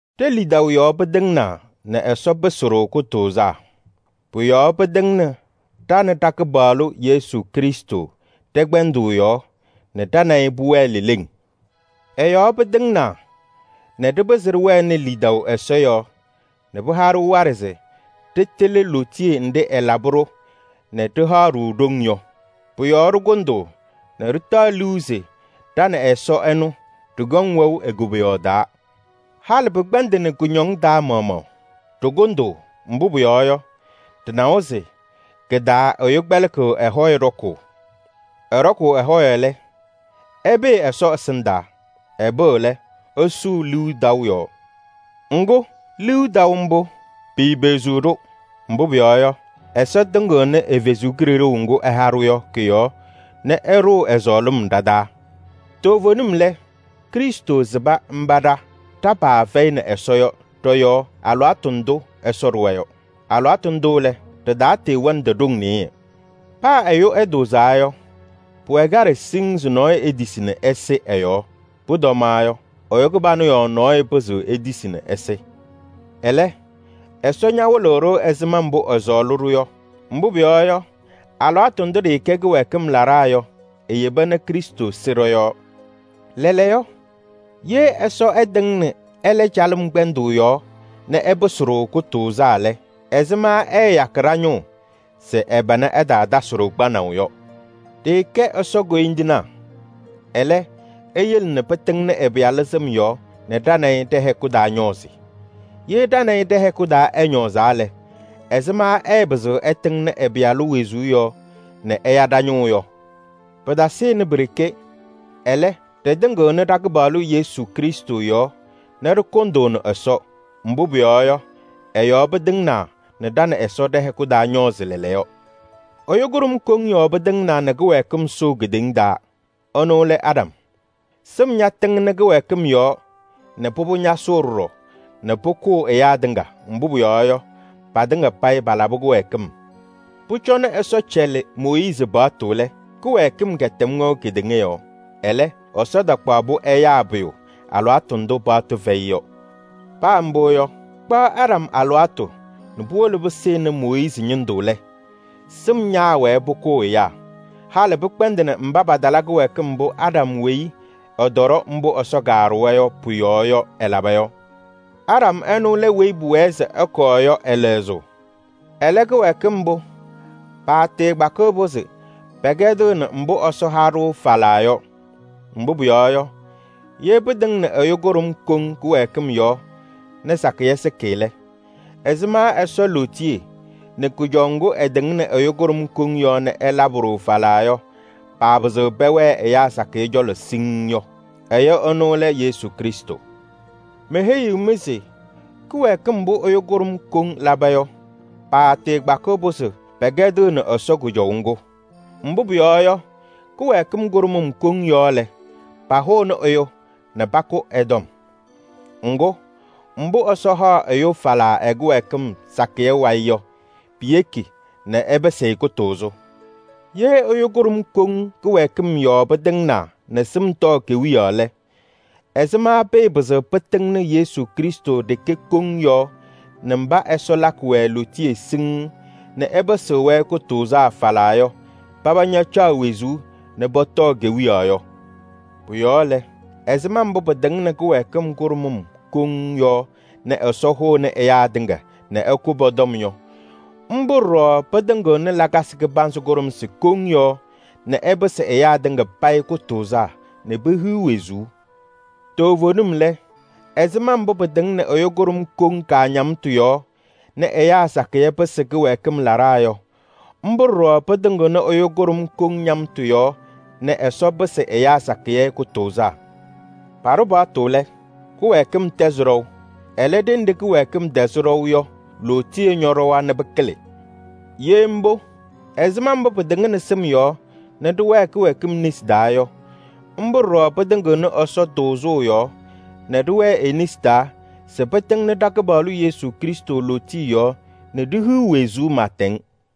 Ɖe-lidaʋ yɔɔ pɩtɩŋnaa nɛ Ɛsɔ pɩsɩ-ɖʋ kʋtʋʋzaa. Pʋ-yɔɔ pɩtɩŋnɩ ɖa nɛ ɖa-Kɩpaɣlʋ Yesu Krɩstʋ ɖɛ-kpɛndʋʋ yɔɔ nɛ ɖa nɛ ɩ pʋwɛɛ leleŋ. Ɛ-yɔɔ pɩtɩŋnaa nɛ ɖɩpɩzɩ ɖɩwɛnɩ lidaʋ Ɛsɔ yɔɔ nɛ pɩha-ɖʋ waɖɛ se ɖɩtɩlɩ lootiye nɖɩ ɛlabɩ-ɖʋ nɛ ɖɩhaɣ-ɖʋ ɖoŋ yɔ. Pʋ-yɔɔ ɖɩkʋndʋʋ nɛ ɖɩtaɣ liu se ɖa nɛ Ɛsɔ ɛnʋ ɖɩkɔŋ wɛʋ e-koboyaɣ taa. Halɩ pɩkpɛndɩnɩ kʋñɔŋ taa maɣmaɣ, ɖɩkʋndʋʋ, mbʋ pʋyɔɔ yɔ, ɖɩnawa se kɩ-taa ɛyʋ kpɛlɩkɩɣ ɛ-hɔyɛ ɖɔkʋʋ. Ɛɖɔkʋʋ ɛ-hɔyɛ lɛ, ɛpɩɩ Ɛsɔ ɛsɩndaa. Ɛpɩɣ lɛ, ɛsʋʋ liu taʋ yɔɔ. Ŋgʋ, liu taʋ mbʋ, piipeɣziɣ-ɖʋ. Mbʋ pʋyɔɔ yɔ, Ɛsɔ tɩŋnɩ ɛ-Kalɩzaɣ ŋga ɛha-ɖʋ yɔ kɔ-yɔɔ nɛ ɛɖʋ ɛ-sɔɔlɩm ɖa-taa. Toovenim lɛ, Krɩstʋ sɩba mba ɖa ɖa-paa fɛyɩnɩ Ɛsɔ yɔ ɖɔ-yɔɔ alɩwaatʋ ndʋ Ɛsɔ ɖʋwa yɔ. Alɩwaatʋ ndʋ lɛ, ɖɩtatɩɩwɛnɩdɩ ɖoŋ nɩɩyɩ. Paa ɛyʋ ɛtʋʋzaa yɔ, pʋwɛ kaɖɛ siŋŋ se nɔɔyʋ etisi nɛ ɛsɩ ɛ-yɔɔ. Pʋtɔmaɣ yɔ, ɛyʋ kɩbanʋ yɔɔ nɔɔyʋ pɩzɩɣ etisi nɛ ɛsɩ. Ɛlɛ, Ɛsɔ ñawɩlɩ-ɖʋ ɛzɩma mbʋ ɛsɔɔlɩ-ɖʋ yɔ. Mbʋ pʋyɔɔ yɔ, alɩwaatʋ ndʋ ɖɩɩkɛ kɩwɛɛkɩm laɖaa yɔ eyeba nɛ Krɩstʋ sɩ ɖɔ-yɔɔ. Lɛɛlɛɛyɔ, ye Ɛsɔ ɛtɩŋnɩ ɛlɛ calɩm kpɛndʋʋ yɔɔ nɛ ɛpɩsɩ-ɖʋ kʋtʋʋzaa lɛ, ɛzɩma ɛɛyakɩ ɖa-ñʋʋ se ɛ-pana ɛtaatasɩ-ɖʋ kpanaʋ yɔ? Ɖɩɩkɛ Ɛsɔ koyindinaa. Ɛlɛ, eyele nɛ pɩtɩŋnɩ ɛ-Pɩyalʋ sɩm yɔɔ nɛ ɖa nɛ ɩ ɖɛ-hɛkʋ taa ñɔɔzɩ. Ye ɖa nɛ ɩ ɖɛ-hɛkʋ taa ɛñɔɔzaa lɛ, ɛzɩma ɛɛpɩzɩɣ ɛtɩŋnɩ ɛ-Pɩyalʋ wezuu yɔɔ nɛ ɛya ɖa-ñʋʋ yɔ? Pɩtasɩnɩ pi-ɖeke, ɛlɛ, ɖɩtɩŋɩɣnɩ ɖa-Kɩpaɣlʋ Yesu Krɩstʋ yɔɔ nɛ ɖɩkʋndʋʋnɩ Ɛsɔ. Mbʋ pʋyɔɔ yɔ, ɛ-yɔɔ pɩtɩŋnaa nɛ ɖa nɛ Ɛsɔ ɖɛ-hɛkʋ taa ñɔɔzɩ lɛɛlɛɛyɔ. Ɛyʋ kʋɖʋm koŋ yɔɔ pɩtɩŋnaa nɛ kɩwɛɛkɩm sʋʋ kedeŋa taa: ɛnʋ lɛ Aɖam. Sɩm ñatɩŋnɩ kɩwɛɛkɩm yɔɔ nɛ pʋbʋ ñasʋʋ ɖɔɖɔ nɛ pʋkʋʋ ɛyaa tɩŋa, mbʋ pʋyɔɔ yɔ, patɩŋa payɩ palabɩ kɩwɛɛkɩm. Pʋcɔ nɛ Ɛsɔ cɛlɩ Mooyiizi paɣtʋ lɛ, kɩwɛɛkɩm kɛtɛm wɛʋ kedeŋa yɔɔ. Ɛlɛ, Ɛsɔ takpaɣ-pʋ ɛyaa pʋyʋ alɩwaatʋ ndʋ paɣtʋ fɛyɩ yɔ. Paa mbʋ yɔ, kpaɣ Aɖam alɩwaatʋ nɛ puwolo pɩsɩnɩ Mooyiizi ñɩndʋ lɛ, sɩm ñaawɛɛ pʋkʋʋ ɛyaa. Halɩ pɩkpɛndɩnɩ mba patala kɩwɛɛkɩm mbʋ Aɖam weyi ɛtɔɖɔ mbʋ Ɛsɔ kaɖʋwa yɔ pʋ-yɔɔ yɔ, ɛlaba yɔ. Aɖam ɛnʋ lɛ weyi pʋwɛɛ se ɛkɔɔ yɔ ɛ-lɛzʋʋ. Ɛlɛ, kɩwɛɛkɩm mbʋ, paatɩɩkpakɩɣ-pʋ se pɛkɛdɩɣnɩ mbʋ Ɛsɔ ha-ɖʋ falaa yɔ. Mbʋ pʋyɔɔ yɔ, ye pɩtɩŋnɩ ɛyʋ kʋɖʋm koŋ kɩwɛɛkɩm yɔɔ nɛ sakɩyɛ sɩkɩ lɛ, ɛzɩma Ɛsɔ lootiye nɛ kʋjɔʋ ŋgʋ ɛtɩŋnɩ ɛyʋ kʋɖʋm koŋ yɔɔ nɛ ɛlabɩ-ɖʋ falaa yɔ, paapɩzɩɣ pɛwɛɛ ɛyaa sakɩyɛ cɔlɔ siŋŋ yɔ? Ɛyʋ ɛnʋ lɛ Yesu Krɩstʋ. Meheyiɣ-mɩ se kɩwɛɛkɩm mbʋ ɛyʋ kʋɖʋm koŋ laba yɔ, paatɩɩkpakɩɣ-pʋ se pɛkɛdɩɣnɩ Ɛsɔ kʋjɔʋ ŋgʋ. Mbʋ pʋyɔɔ yɔ, kɩwɛɛkɩm kʋɖʋmʋm koŋ yɔɔ lɛ, pahʋʋnɩ ɛyʋ nɛ pakʋ ɛ-tɔm. Ŋgʋ, mbʋ Ɛsɔ haɣ ɛyʋ falaa ɛ-kɩwɛɛkɩm sakɩyɛ wayɩ yɔ, piyeki nɛ ɛpɩsɩ-ɩ kʋtʋʋzʋ. Ye ɛyʋ kʋɖʋm koŋ kɩwɛɛkɩm yɔɔ pɩtɩŋnaa nɛ sɩm tɔɔ kewiyaɣ lɛ, ɛzɩma pɩɩpɩzɩɣ pɩtɩŋnɩ Yesu Krɩstʋ ɖeke koŋ yɔɔ nɛ mba Ɛsɔ lakɩ-wɛ lootiye siŋŋ nɛ ɛpɩsɩɣ-wɛ kʋtʋʋzaa falaa yɔ, paba ñacaɣ wezuu nɛ pɔtɔɔ kewiyaɣ yɔ? Pʋ-yɔɔ lɛ, ɛzɩma mbʋ pɩtɩŋnɩ kɩwɛɛkɩm kʋɖʋmʋm koŋ yɔɔ nɛ Ɛsɔ hʋnɩ ɛyaa tɩŋa nɛ ɛkʋ pɔ-tɔm yɔ, mbʋ ɖɔɖɔ pɩtɩŋɩɣnɩ lakasɩ kɩbanzɩ kʋɖʋmsɩ koŋ yɔɔ nɛ ɛpɩsɩ ɛyaa tɩŋa payɩ kʋtʋʋzaa nɛ pehiɣ wezuu. Toovenim lɛ, ɛzɩma mbʋ pɩtɩŋnɩ ɛyʋ kʋɖʋm koŋ kaañamtʋ yɔɔ nɛ ɛyaa sakɩyɛ pɩsɩ kɩwɛɛkɩm laɖaa yɔ, mbʋ ɖɔɖɔ pɩtɩŋɩɣnɩ ɛyʋ kʋɖʋm koŋ ñamtʋ yɔɔ nɛ Ɛsɔ pɩsɩ ɛyaa sakɩyɛ kʋtʋʋzaa. Paɖʋ paɣtʋ se kɩwɛɛkɩm ɛtɛzɩ ɖɔʋ. Ɛlɛ, ɖenɖe kɩwɛɛkɩm tɛzɩ ɖɔʋ yɔ, lootiye ñɔɖɔwa nɛ pɩkɩlɩ. Ye mbʋ, ɛzɩma mbʋ pɩtɩŋnɩ sɩm yɔɔ nɛ ɖɩwɛɛ kɩwɛɛkɩm nesi taa yɔ, mbʋ ɖɔɖɔ pɩtɩŋɩɣnɩ Ɛsɔ tʋʋzʋʋ yɔɔ nɛ ɖɩwɛɛ e-nesi taa se pɩtɩŋnɩ ɖa-Kɩpaɣlʋ Yesu Krɩstʋ lootiye yɔɔ nɛ ɖihiɣ wezuu pɩɩtɛŋ.